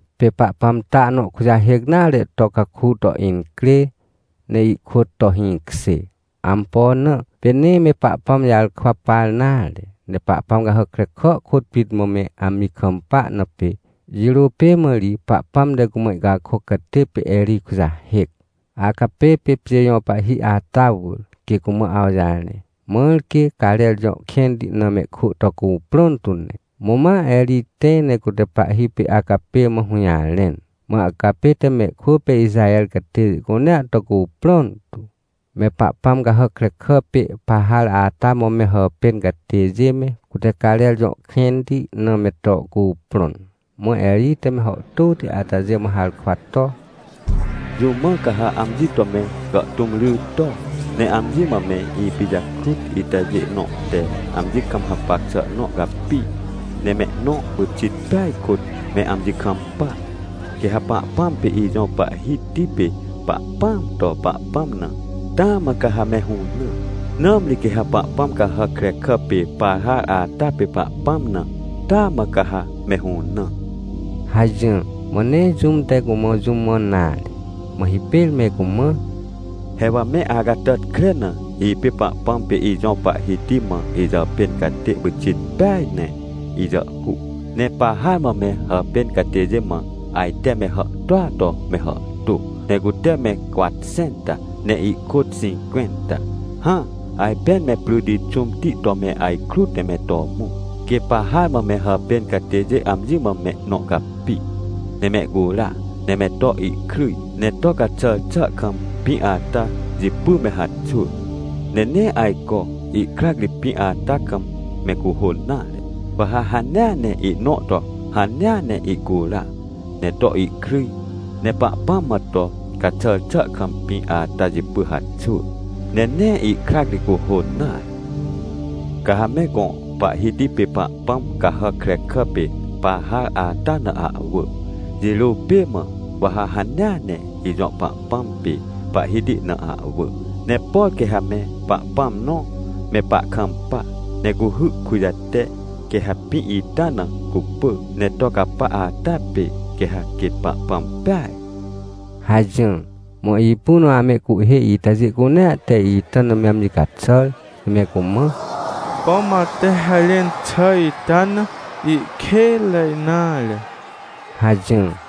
Pê Pahpãm ta nõ kujahêc nare to caku to incrê, ne ihkôt to hĩkjê. Ampo na? Pê nee me Pahpãm jarkwa par nare, ne pahpãm cahàc krekà kôt pit mã me amji kampa na pê. Jirô pê mã ri Pahpãm te cumã ihcakôc catê pê Erij kujahêc, Acapê pê pjê jõ pahhi ata wỳr, quê cumã awjarẽ, mãr quê Carer jõ kẽnti na mehkwỳ to cuprõn tu ne. Mã ma Erij tẽ, ne cute pahhi pê Acapê mã hũjarẽn. Mã Acapê te mehkwỳ pê Ixaher catêjê cunea to cuprõn tu, me pahpãm cahàc krekà pê Pahar ata mã me hàpên catêjê me, cute Carer jõ kẽnti na me to cuprõn. Mã Erij te me hàhtôti atajê mã harkwa to: — Jũ mã ca ha amji to me gàhtũm ry to, ne amji mã me ipijakrut itajê nõ te amji kam hapac xà nõ capi, ne mehnõ pyxit peaj kôt me amji kampa? Quê ha Pahpãm pê ijõ Pahhiti pê Pahpãam to Pahpãm na, taa mã ca ha me hũnã! Nãmri quê ha pahpãm cahàc krekà pê Pahar ata pê pahpãm na, taa mã ca ha me hũnã! — hajỹr. Mã nee jũm te cumã jũ mãn nare. Mã hipêr me cumã: — He wa me acatàtkre na, ipê Pahpãm pê ijõ Pahhiti mã ijàpên catê pyxit peaj ne ijàhhuc. Ne Pahar mã me hàpên catêjê mã ajte me hàhtôa to me hàhtô, ne cute me cwatxẽnta ne ihkôt xĩncwẽnta. Hã, ajpên me pryti xũmti to me ajkrut ne me to mõ. Quê Pahar mã me hàpên catêjê amji mã mehnõ capi, ne mehcura, ne me to ihkryj ne to caxàr xà kam pĩ ata jipy me haxwỳ. Ne nee ajco, ihkrac ri pĩ ata kam me cuhôn nare. Wa ha hanea ne ihnõ to hanea ne ihcura, ne to ihkryj, ne Pahpãm mã to caxàr xà kam pĩ ata jipy haxwỳ, ne nee ihkrac ri cuhôn nare. Ca ha me gõ pahhiti pê pahpãm cahàc krekà pê Pahar ata na ahwỳ, jirô pê mã, wa ha hanea ne ijõ Pahpãm pê Pahhiti na ahwỳ. Ne por quê ha me Pahpãm nõ me pahkampa, ne cuhy kujate, quê ha pĩ ita na cupỳ ne to capa ata pê, quê ha quêt Pahpãm peaj — hajỹr. Mã ipu na amehcuhhê itajê cunea te ita na me amji caxàr, ne me cumã: — Pom ate harẽn xà ita na ihkênre nare — hajỹr.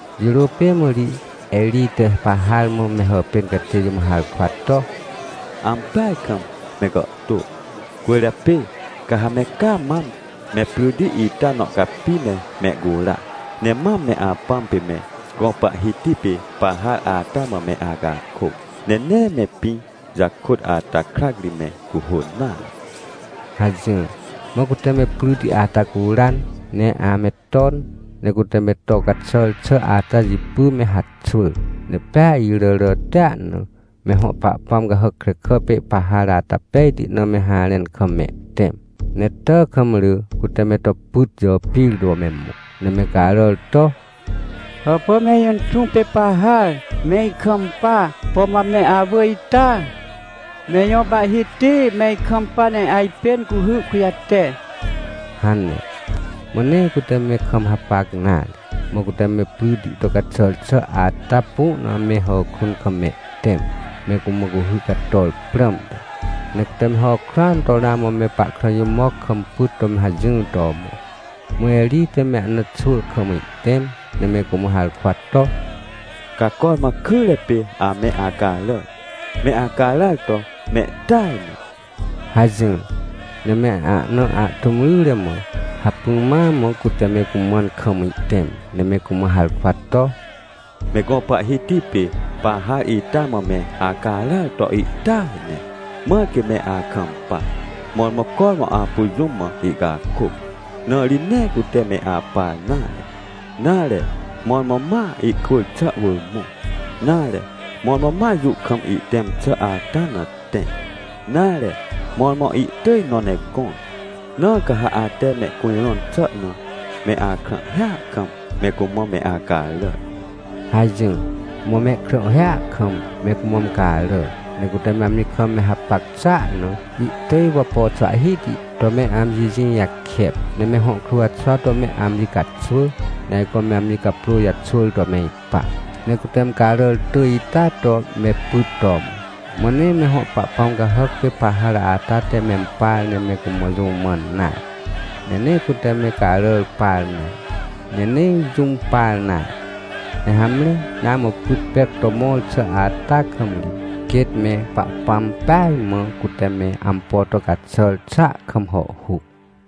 Jirô pê mã ri Erij te Pahar mã me hàpên catêjê mã harkwa to: — Ampeaj kam me gàhtô, cwỳrjapê ca ha me caa mam me pryti ita nõ capi ne mehcura, ne mam me apãm pê me gõ pahhiti pê Pahar ata mã me acakôc, ne nee me pĩ jakôt ata krac ri me cuhôn nare — hajỹr. Mã cute me pryti ata curan, ne ame ton, ne cute me to caxàr xà ata jipy me haxwỳr. Ne pea iràràtia na, me hõ pahpãm cahàc krekà pê Pahar ata pejti na me harẽn kam mehtẽm, ne tàkamrỳ cute me to pyt jàpir to me mõ, ne me caràr to: — Hàpà, me ijõ inxũ pê Pahar, me ikampa, pom wa me awỳ ita? Me ijõ pahhiti, me ikampa ne ajpên cuhy kujate! — hane. Mã nee cute me kam hapac nare. Mã cute me pryti to caxàr xà ata pu na me hàkrun kam mehtẽm, me cumã cuhy cator prãmte. Ne cute me hàkruan to ramã me pahkrã jimoc kam pyt to me hajỹr to mõ. Mã Erij te me ahna xwỳ kam ihtẽm, ne me cumã harkwa to: — Ca cormã kyre pê ame acaràr, me acaràr to mehtỳaj ne — hajỹr. Ne me ahna ahtũm ryre mã hacpỹ ma mã cute me cumãn kam ihtẽm, ne me cumã harkwa to: — Me gõ pahhiti pê Pahar ita mã me acaràr to ihtỳaj ne, mãr quê me akampa. Mõrmõ cormã apu jũm mã ihcakôc, na ri nee cute me apar nare. Nare, mõrmõ ma ihkwỳr xà wỳr mõ, nare, mõrmõ ma jũ kam ihtẽm xà ata na tẽ, nare, mõrmõ ihtỳj nõ ne gõr, na ca ha ate mehcujrõn xà na me akrãhhia kam me cumã me acaràr! — hajỹr. Mã mehkrãhhia kam me cumã me caràr, ne cute amji kam me hapac xàa na, ihtỳj wapo xwahhihti to me amji jĩ jakep, ne me hõ kruwxwa to me amji caxwỳ, ne ajco me amji caprô jaxwỳr to me ipa. Ne cute me caràr tỳj ita to me pyt to mõ. Mã nee me hõ pahpãm cahàc pê Pahar ata te mempar ne me cumã jũ mãn nare, ne nee cute me caràr par nare, ne nee jũm par nare. Ne hamre, ramã pyt pec to mõr xà ata kam ri, quêt me Pahpãm peaj mã cute me ampo to caxàr xàa kam hàhhuc.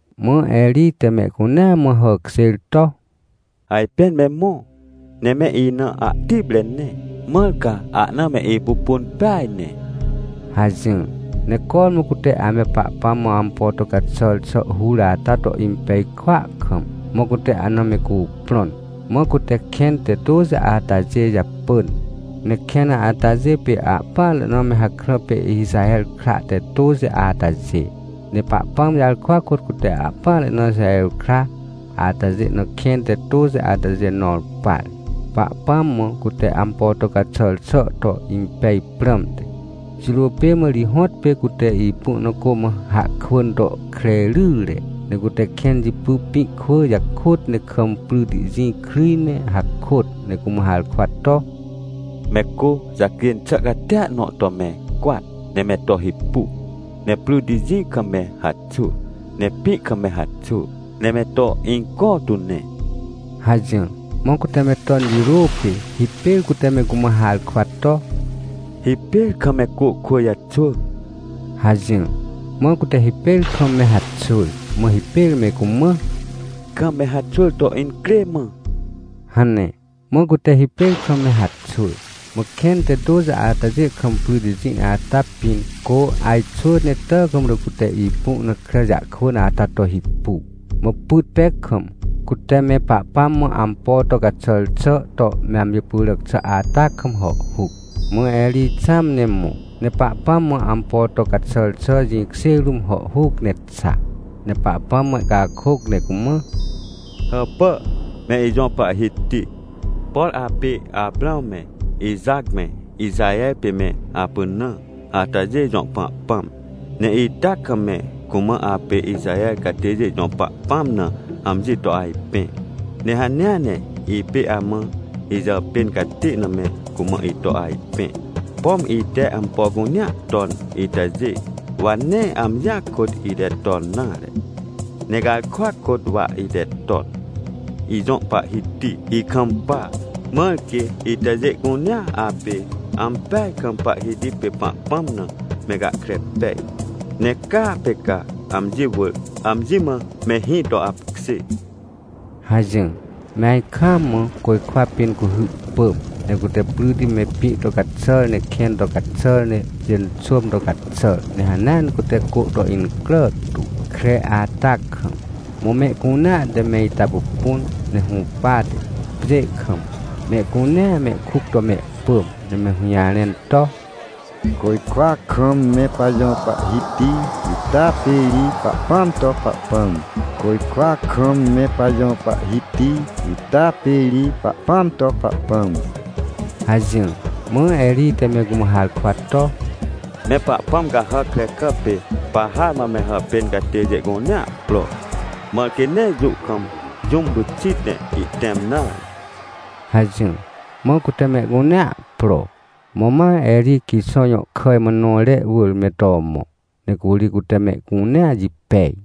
Mã Erij te mehcunea mã hàkjêr to: — Ajpên me mõ, ne me ina ahtipre ne, mãr ca ahna me ipupun peaj ne — hajỹr. Ne cormã cute ame Pahpãm mã ampo to caxàr xà hur ata to impej kwỳa kam, mã cute ahna me cuprõn. Mã cute kẽn te tôxi atajê japỳn. Ne kẽn atajê pê ahpỹanre na me hakrã pê Ixaher kra te tôxi atajê. Ne Pahpãm jarkwa kôt cute ahpỹanre na Ixaher kra atajê na kẽn te tôxi atajê nõr par, Pahpãm mã cute ampo to caxàr xà to impej prãmte. Jirô pê mã ri hõtpê cute ipu na cô mã hahkwỳn to kre ryre. Ne cute kẽn jipy pĩ kwỳ jakôt, ne kam pryti jĩ kryj ne hakôt, ne cumã harkwa to: — Me cô jacjên xà catia nõ to me cwat, ne me to hipu, ne pryti jĩ kam me haxwỳ, ne pĩ kam me haxwỳ, ne me to inco tu ne — hajỹr. Mã cute me ton jirô pê, hipêr cute me cumã harkwa to: — Hipêr kam me cô kwỳ jaxwỳ — hajỹr. Mã cute hipêr kam me haxwỳr. Mã hipêr me cumã: — Kam me haxwỳr to incrê mã — hane. Mã cute hipêr kam me haxwỳr. Mã kẽn te tôxi atajê kam pryti jĩ ata pĩn, cô ajxwỳ ne tàkamrỳ cute ipu na kre jahkwỳn ata to hipu. Mã pyt pec kam, cute me Pahpãm mã ampo to caxàr xà to me amji pyràc xà ata kam hàhhuc. Mã Erij xãm ne mõ, ne Pahpãm mã ampo to caxàr xà jĩkjê rũm hàhhuc ne xa, ne Pahpãm mã ihcakôc, ne cumã: — Hàpà, me ijõ Pahhiti. Por apê Aprãw me, Ixac me, Ixaher pê me apynã atajê jõ Pahpãm. Ne ita kam me cumã apê Ixaher catêjê jõ Pahpãm na amji to ajpẽ, ne hanea ne ipê amã ijàpên catê na me cumã ito ajpẽ. Pom ite ampo cunea ton itajê, wa nee amjia kôt ite ton nare, ne garkwa kôt wa ite ton! Ijõ Pahhiti ikampa, mãr quê itajê cunea apê ampeaj kam Pahhiti pê Pahpãm na, me gahkre pej, ne caa pê ca, amji wỳr, amji mã mehĩ to apkjê — hajỹr. Me ajkaam mã côjkwa pĩn cuhy pỳm! Ne cute pryti me pĩ to caxàr, ne kẽn to caxàr, ne pjênxôm to caxàr, ne hanea ne cute cô to incrà tu, kre ata kam! Mã mehcunea te me ita pupun, ne hũpate, pjê kam, mehcunea mehkuc to mehpỳm, ne me hũjarẽn to: — Côjkwa kam me pajõ Pahhiti ita pê ri Pahpãam to Pahpãm! Côjkwa kam me pajõ Pahhiti ita pê ri Pahpãam to Pahpãm! — hajỹr. Mã Erij te me cumã harkwa to: — Me pahpãm cahàc krekà pê Pahar mã me hàpên catêjê cunea pro, mãr quê nee jũ kam jũm pyxit ne ihtẽm nare! — hajỹr. Mã cute mehcunea pro, mã ma Erij Quixõ jõ kàj mã nõre wỳr me to mõ, ne curi cute mehcunea jipej.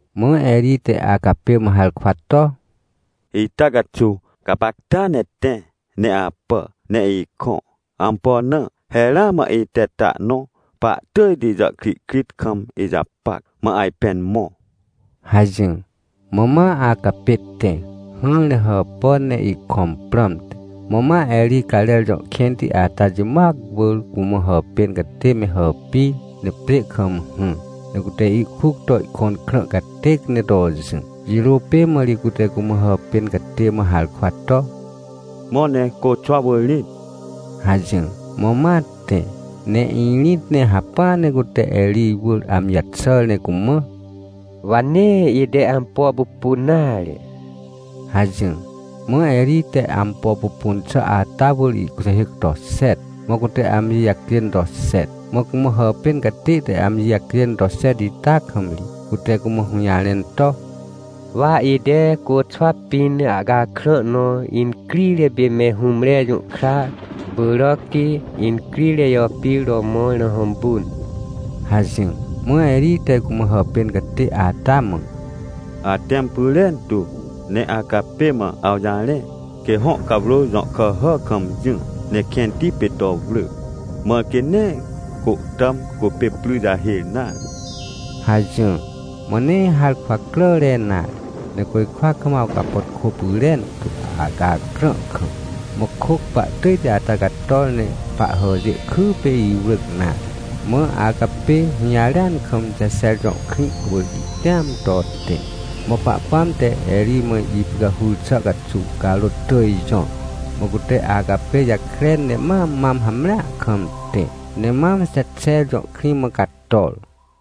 Mã Erij te Acapê mã harkwa to: — Ita caxuw gapacta ne tẽ ne apà ne ikõ. Ampo na? He ramã ite ta nõ pahtỳjti jàhkrihkrit kam ijapac, mã ajpên mõ! — hajỹr. Mã ma Acapê tẽ, hỹr ne hàpàn ne ihkõm prãmte. Mã ma Erij Carer jõ kẽnti ata jimoac wỳr cumã hàpên catê me hàpir, ne pjê kam hỹr, ne cute ihkuc to ihkõn krã catêc ne to jỹ. Jirô pê mã ri cute cumã hàpên catê mã harkwa to: — Mõ ne côxwa wỳr rĩt! — hajỹr. Mã ma tẽ, ne irĩt ne hacpỹa ne cute Erij wỳr amji jaxàr ne cumã: — Wa nee ite ampo pupun nare — hajỹr. Mã Erij te ampo pupun xà atawỳr ihkujahêc to xet, mã cute amji jacjên to xet. Mã cumã hàpên catê te amji jacjên to xet ita kam ri, cute cumã hũjarẽn to: — Wa ite côxwa pĩn ahcakrã nõ incrire pê me hũmre jũhkra pyràcti incrire jàpir to mõr na hõmpun — hajỹr. Mã Erij te cumã hàpên catê ata mã: — Atẽm pyrentu, ne Acapê mã awjarẽ, quê hõ cawrô jõ kàhà kam jỹ, ne kẽnti pê to wrỳ, mãr quê nee côhtàm cupê pry jahêr nare — hajỹr. Mã nee harkwa cràre nare. Ne côjkwa kam awcapàtkô pyrentu, ahcakrã kam. Mã kôc pahtỳjti ata cator, ne pahhàjê kypê iwrỳc nare. Mã Acapê hũjarêan kam Jexer jõ krĩ wỳr ihtẽam to tẽ. Mã Pahpãm te Erij mã ipicahur xà caxuw, carôt tỳj jõr. Mã cute Acapê jakren, ne ma mam hamrea kam tẽ, ne mam Jexer jõ krĩ mã cator.